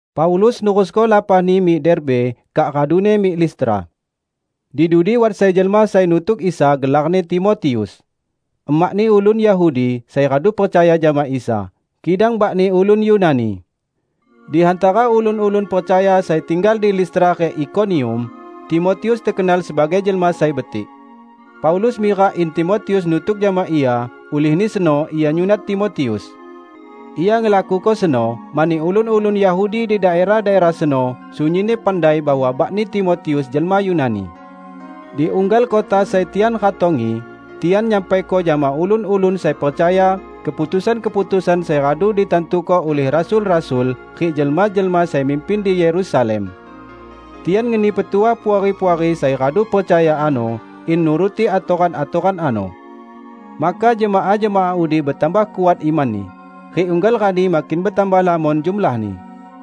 Paulus nerusko lapahni mik Derbe, kak raduni mik Listra. Di dudi wat sai jelma sai nutuk Isa gelarni Timotius. Emakni ulun Yahudi, sai radu percaya jama Isa; kidang bakni ulun Yunani. Di hantara ulun-ulun percaya sai tinggal di Listra rik Ikonium, Timotius tekenal sebagai jelma sai betik. Paulus mirak in Timotius nutuk jama ia; ulihni seno ia nyunat Timotius. Ia ngelakuko seno, mani ulun-ulun Yahudi di daerah-daerah seno sunyinni pandai bahwa bakni Timotius jelma Yunani. Di unggal kota sai tian ratongi, tian nyampaiko jama ulun-ulun sai percaya keputusan-keputusan sai radu ditantuko ulih rasul-rasul rik jelma-jelma sai mimpin di Yerusalem. Tian ngeni petuah puari-puari sai radu percaya ano in nuruti atoran-atoran ano. Maka jemaah-jemaah udi betambah kuat imanni, rik unggal rani makin betambah lamon jumlahni.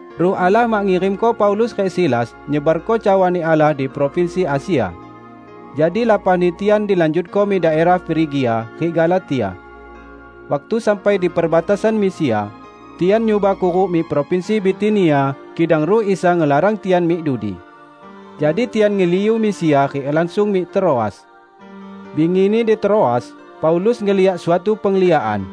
Ruh Allah mak ngirimko Paulus rik Silas nyebarko cawani Allah di provinsi Asia. Jadi lapahni tian dilanjutko mik daerah Frigia rik Galatia. Waktu sampai di perbatasan Misia, tian nyuba kuruk mik provinsi Bitinia, kidang Ruh Isa ngelarang tian mik dudi. Jadi tian ngeliu Misia rik langsung mik Troas. Bingini, di Troas, Paulus ngeliak suatu pengliakan.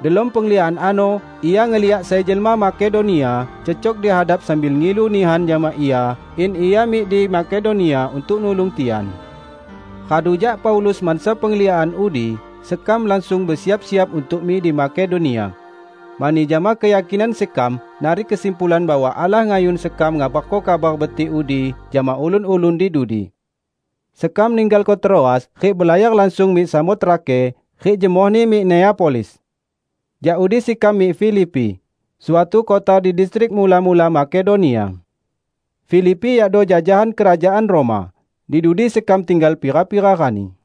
Delom pengliakan ano ia ngeliak sai jelma Makedonia cecok di hadap sambil ngilu nihan jama ia in ia mik di Makedonia untuk nulung tian. Radu jak Paulus mansa pengliakan udi, sekam langsung besiap-siap untuk mik di Makedonia. Mani jama keyakinan sekam narik kesimpulan bahwa Allah ngayun sekam ngabarko Kabar Betik udi jama ulun-ulun di dudi. Sekam ninggalko Troas rik belayar langsung mik Samotrake, rik jemohni mik Neapolis. Jak udi sekam mik Filipi, suatu kota di distrik mula-mula Makedonia. Filipi yakdo jajahan kerajaan Roma. Di dudi sekam tinggal pira-pira rani.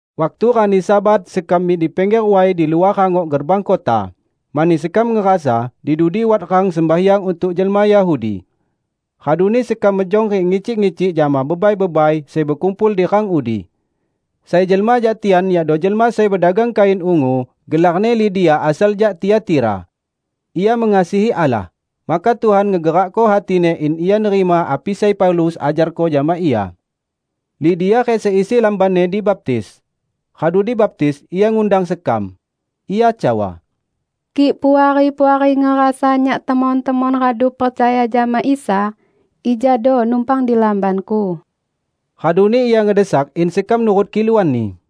Waktu rani Sabat sekam mik di pingger way di luah rangok gerbang kota, mani sekam ngerasa di dudi wat rang sembahyang untuk jelma Yahudi. Raduni sekam mejong rik ngicik-ngicik jama bebai-bebai sai bekumpul di rang udi. Sai jelma jak tian yakdo jelma sai bedagang kain ungu, gelarni Lidia asal jak Tiatira. Ia mengasihi Allah, maka Tuhan ngegerakko hatini in ia nerima api sai Paulus ajarko jama ia. Lidia rik seisi lambanni dibaptis. Radu dibaptis ia ngundang sekam. Ia cawa, "Kik Puari-puari ngerasa nyak temon-temon radu percaya jama Isa, ijado numpang di lambanku." Raduni ia ngedesak in sekam nurut kiluanni.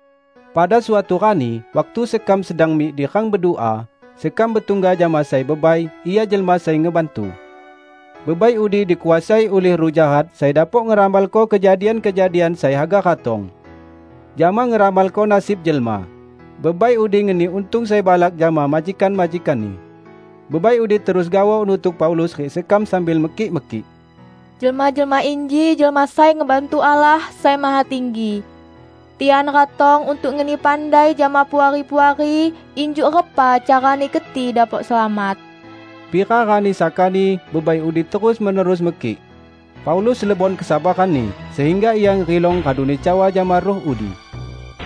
Pada suatu rani waktu sekam sedang mik di rang bedua, sekam betungga jama sai bebai; ia jelma sai ngebantu. Bebai udi dikuasai ulih ruh jahat sai dapok ngeramalko kejadian-kejadian sai haga ratong. Jama ngeramalko nasib jelma, bebai udi ngeni untung sai balak jama majikan-majikanni. Bebai udi terus gaoh nutuk Paulus rik sekam sambil mekik-mekik, "Jelma-jelma inji jelma sai ngebantu Allah Sai Mahatinggi! Tian ratong untuk ngeni pandai jama Puari-puari injuk repa carani keti dapok selamat!" Pira rani sakani bebai udi terus-menerus mekik. Paulus lebon kesabaranni, sehingga ia ngerilong raduni cawa jama ruh udi,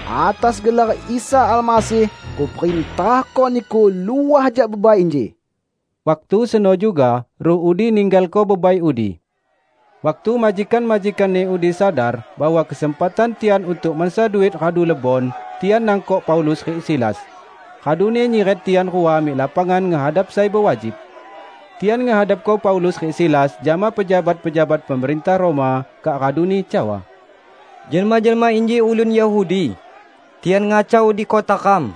"Atas gelar Isa Almasih kuperintahko niku luah jak bebai inji!" Waktu seno juga ruh udi ninggalko bebai udi. Waktu majikan-majikanni udi sadar bahwa kesempatan tian untuk mansa duit radu lebon, tian nangkok Paulus rik Silas, raduni nyiret tian rua mik lapangan ngehadap sai bewajib. Tian ngehadapko Paulus rik Silas jama pejabat-pejabat pemerintah Roma, kak raduni cawa, "Jelma-jelma inji ulun Yahudi. Tian ngacau di kota ram.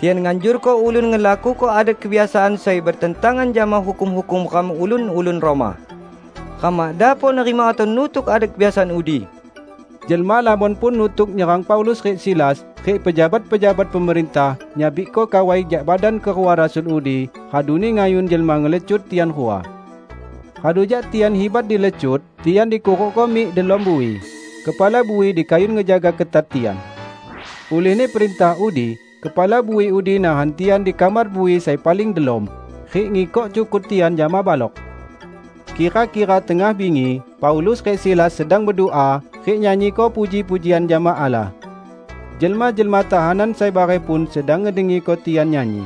Tian nganjurko ulun ngelakuko adat kebiasaan sai betentangan jama hukum-hukum ram, ulun-ulun Roma. Ram mak dapok nerima atau nutuk adat kebiasaan udi!" Jelma lamon pun nutuk nyerang Paulus rik Silas; rik pejabat-pejabat pemerintah nyabikko kawai jak badan kerua rasul udi raduni ngayun jelma ngelecut tian rua. Radu jak tian hibat dilecut, tian dikurukko mik delom bui. Kepala bui dikayun ngejaga ketat tian. Ulihni perintah udi, kepala bui udi nahan tian di kamar bui sai paling delom, rik ngikok cukut tian jama balok. Kira-kira tengah bingi Paulus rik Silas sedang bedua rik nyanyiko puji-pujian jama Allah. Jelma-jelma tahanan sai bareh pun sedang ngedengiko tian nyanyi.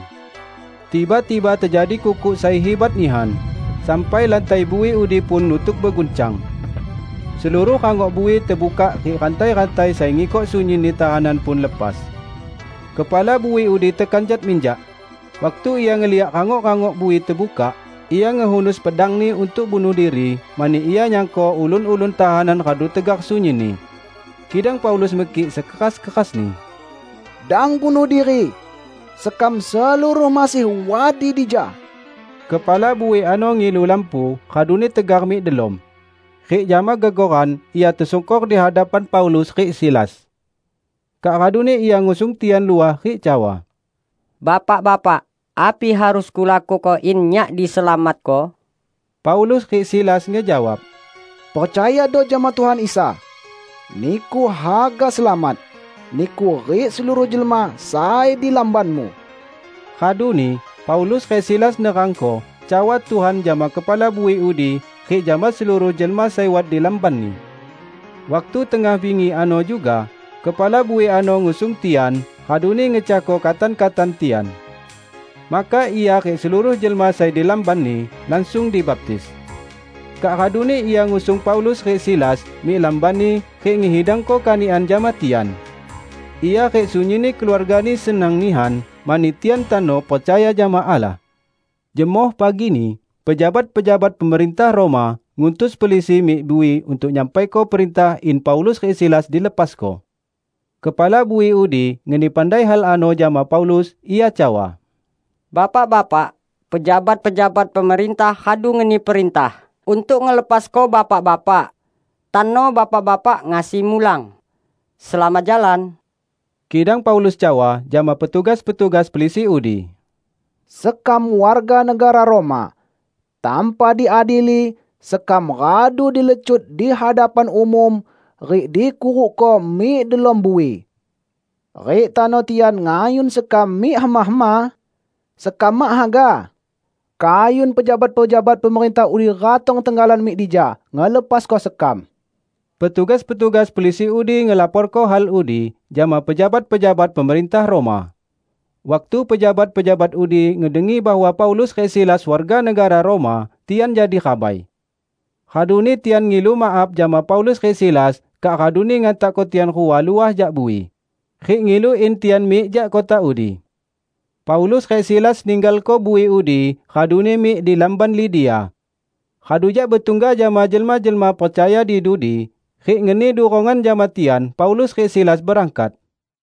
Tiba-tiba tejadi kukuk sai hibat nihan, sampai lantai bui udi pun nutuk beguncang. Seluruh rangok bui tebukak rik rantai-rantai sai ngikok sunyinni tahanan pun lepas. Kepala bui udi tekanjat minjak. Waktu ia ngeliak rangok-rangok bui tebukak, ia ngehunus pedangni untuk bunuh diri mani ia nyangko ulun-ulun tahanan radu tegar sunyinni. Kidang Paulus mekik sekeras-kerasni, "Dang bunuh diri! Sekam seluruh masih wat di dija!" Kepala bui ano ngilu lampu raduni tegar mik delom, rik jama gegoran ia tesungkor di hadapan Paulus rik Silas. Kak raduni ia ngusung tian luah rik cawa, "Bapak-bapak, api harus kulakuko in nyak diselamatko?" Paulus rik Silas ngejawab, "Percayado jama Tuhan Isa! Niku haga selamat -- niku rik seluruh jelma sai di lambanmu!" Raduni Paulus rik Silas nerangko cawa Tuhan jama kepala bui udi rik jama seluruh jelma sai wat di lambanni. Waktu tengah bingi ano juga, kepala bui ano ngusung tian raduni ngecahko katan-katan tian. Maka ia rik seluruh jelma sai di lambanni langsung dibaptis. Kak raduni ia ngusung Paulus rik Silas mik lambanni rik ngehidangko kanikan jama tian. Ia rik sunyinni keluargani senang nihan mani tian tano percaya jama Allah. Jemoh pagini, pejabat-pejabat pemerintah Roma ngutus pelisi mik bui untuk nyampaiko perintah in Paulus rik Silas dilepasko. Kepala bui udi ngeni pandai hal ano jama Paulus. Ia cawa, "Bapak-bapak, pejabat-pejabat pemerintah radu ngeni perintah untuk ngelepasko Bapak-bapak. Tano Bapak-bapak ngasi mulang. Selamat jalan!" Kidang Paulus cawa jama petugas-petugas pelisi udi, "Sekam warga negara Roma. Tanpa diadili, sekam radu dilecut di hadapan umum rik dikurukko mik delom bui. Rik tano tian ngayun sekam mik hema-hema? Sekam mak haga! Kayun pejabat-pejabat pemerintah udi ratong tenggalan mik dija ngelepasko sekam." Petugas-petugas pelisi udi ngelaporko hal udi jama pejabat-pejabat pemerintah Roma. Waktu pejabat-pejabat udi ngedengi bahwa Paulus rik Silas warga negara Roma, tian jadi rabai. Raduni tian mik ngilu maaf jama Paulus rik Silas, kak raduni ngantakko tian rua luah jak bui, rik ngilu in tian mik jak kota udi. Paulus rik Silas ninggalko bui udi raduni mik di lamban Lidia. Radu jak betungga jama jelma-jelma percaya di dudi, rik ngeni durongan jama tian, Paulus rik Silas berangkat.